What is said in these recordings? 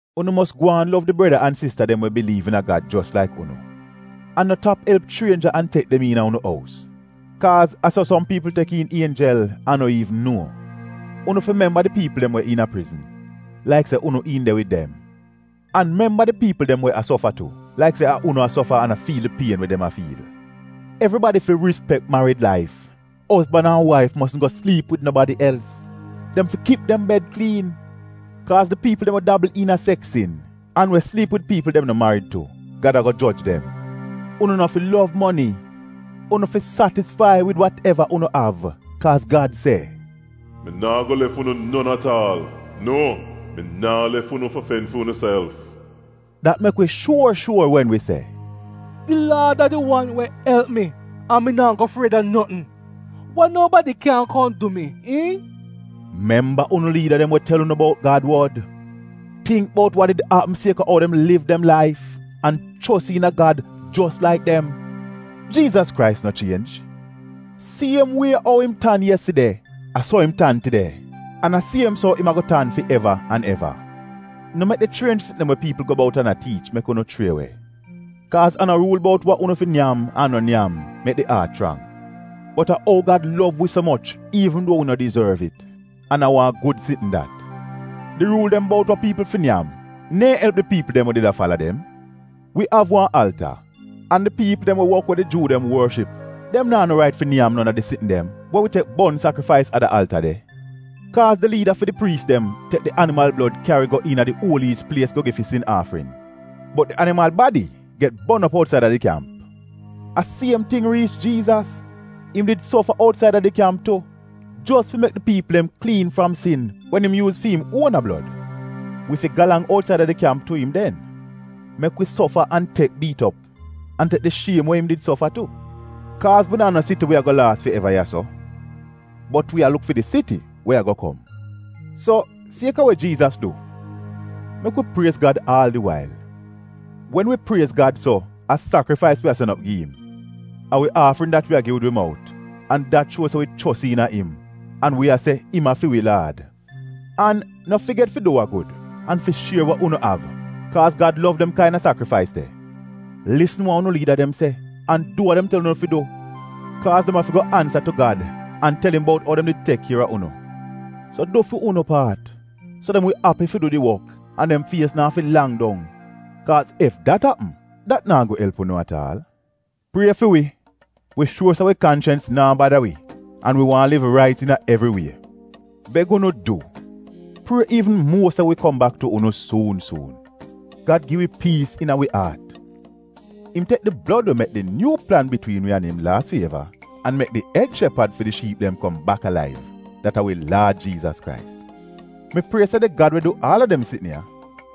Unu mos gwaan lov di breda an sista dem we biliiv iina Gad jos laik unu. An no tap elp chrienja an tek dem iina unu ous, kaaz a so som piipl tek iin ienjel an no iivn nuo. Unu fi memba di piipl dem we iina prizn, laik se a unu iin de wid dem. An memba di piipl dem we a sofa tu, laik se a unu a sofa, an a fiil di pien we dem a fiil. Evribadi fi rispek marid laif, ozban an waif mosn go sliip wid nobadi els — dem fi kip dem bed kliin. Kaaz di piipl dem we dabl iina seks sin, an we sliip wid piipl dem no marid tu, Gad ago joj dem. Unu no fi lov moni. Unu fi satisfai wid wateva unu av, kaaz Gad se, “Mi naa go lef unu non at aal. Nuo mi naa lef unu fi fen fi unuself.” Dat mek wi shuor shuor wen wi se, “Di Laad a di wan we elp mi an mi naa go fried a notn. Wa nobadi kyan kom du mi, iihn?” Memba unu liida dem we tel unu bout Gad wod. Tingk bout wa did apm sieka ou dem liv dem laif, an chos iina Gad jos laik dem. Jiizas Krais no chienj — siem wie ou im tan yeside, a so im tan tide an a siem so im ago tan fi eva an eva. No mek di chrienj sitn dem we piipl go bout an a tiich mek unu chrie we. Kaaz a no ruul bout wa unu fi nyam an no nyam, mek di aat chrang. Bot a ou Gad lov wi so moch iivn duo wi no dizorv it. An a wan gud sitn dat. Di ruul dem bout wa piipl fi nyam neehn elp di piipl dem we did a fala dem. Wi av wan alta, an di piipl dem we wok we di Juu dem worship dem naa no rait fi nyam non a di sitn dem we wi tek bon sakrifais a da alta de. Kaaz di liida fi di priis dem tek di animal blod kyari go iina di Uoliyis Plies go gi fi sin aafrin. Bot di animal badi get bon op outsaida di kyamp. A siem ting riich Jiizas. Im did sofa outsaida di kyamp tu, jos fi mek di piipl dem kliin fram sin wen im yuuz fi im uona blod. Wi fi galang outsaida di kyamp tu im den. Mek wi sofa an tek biit op, an tek di shiem we im did sofa tu. Kaaz wi naa no siti we ago laas fi eva ya-so, bot wi a luk fi di siti we ago kom. So sieka we Jiizas du, mek wi priez Gad aal di wail. Wen wi priez Gad so, a sakrifais wi a sen op gi im. A wi aafrin dat wi a gi wid wi mout, an dat shuo se wi chos iina im, an wi a se im a fi wi Laad. An no figet fi du wa gud, an fi shier we unu av, kaaz Gad lov dem kaina sakrifais de. Lisn wa unu liida dem se, an du wa dem tel unu fi du. Kaaz dem ago afi ansa tu Gad, an tel im bout ou dem did tek kier a unu. So du fi unu paat, so dem wi api fi du di wok an dem fies naa fi lang dong, kaaz ef dat apm, dat naa go elp unu at aal. Prie fi wi. Wi shuor se wi kanchens naa bada wi an wi waahn liv rait iina evri wie. Beg unu du, prie iivn muo se mi wi kom bak tu unu suun suun. Gad gi wi piis iina wi aat. Im tek di blod we mek di nyuu plan bitwiin wi an im laas fi eva, an mek di ed shepad fi di shiip dem kom bak alaiv — dat a wi Laad Jiizas Krais. Mi prie se di Gad, we du aal a dem sitn ya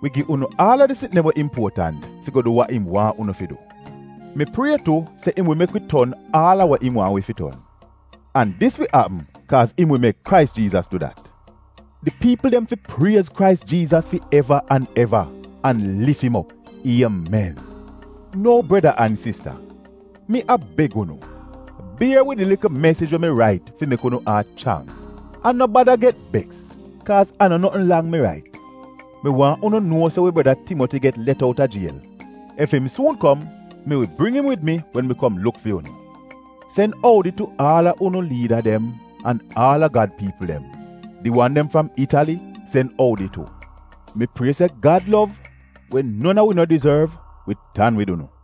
wi gi unu aal a di gud sitn dem we impuotant fi go du wa im waahn unu fi du. Mi prie tu se im wi mek wi ton aal a wa im waahn wi fi ton. An dis wi apm kaaz im wi mek Krais Jiizas du dat. Di piipl dem fi priez Krais Jiizas fi eva an eva an lif im op. Iemen. Nou breda an sista, mi a beg unu, bier wid di likl mesij we mi rait fi mek unu aat chrang, an no bada get beks, kaaz a no notn lang mi rait. Mi waahn unu nuo se wi breda Timoti get let outa jiel. Ef im suun kom, mi wi bring im wid mi wen mi kom luk fi unu. Sen oudi tu aal a unu liida dem an aal a Gad piipl dem. Di wan dem fram Itali sen oudi tu. Mi prie se Gad lov, we non a wi no dizorv, wi tan wid unu.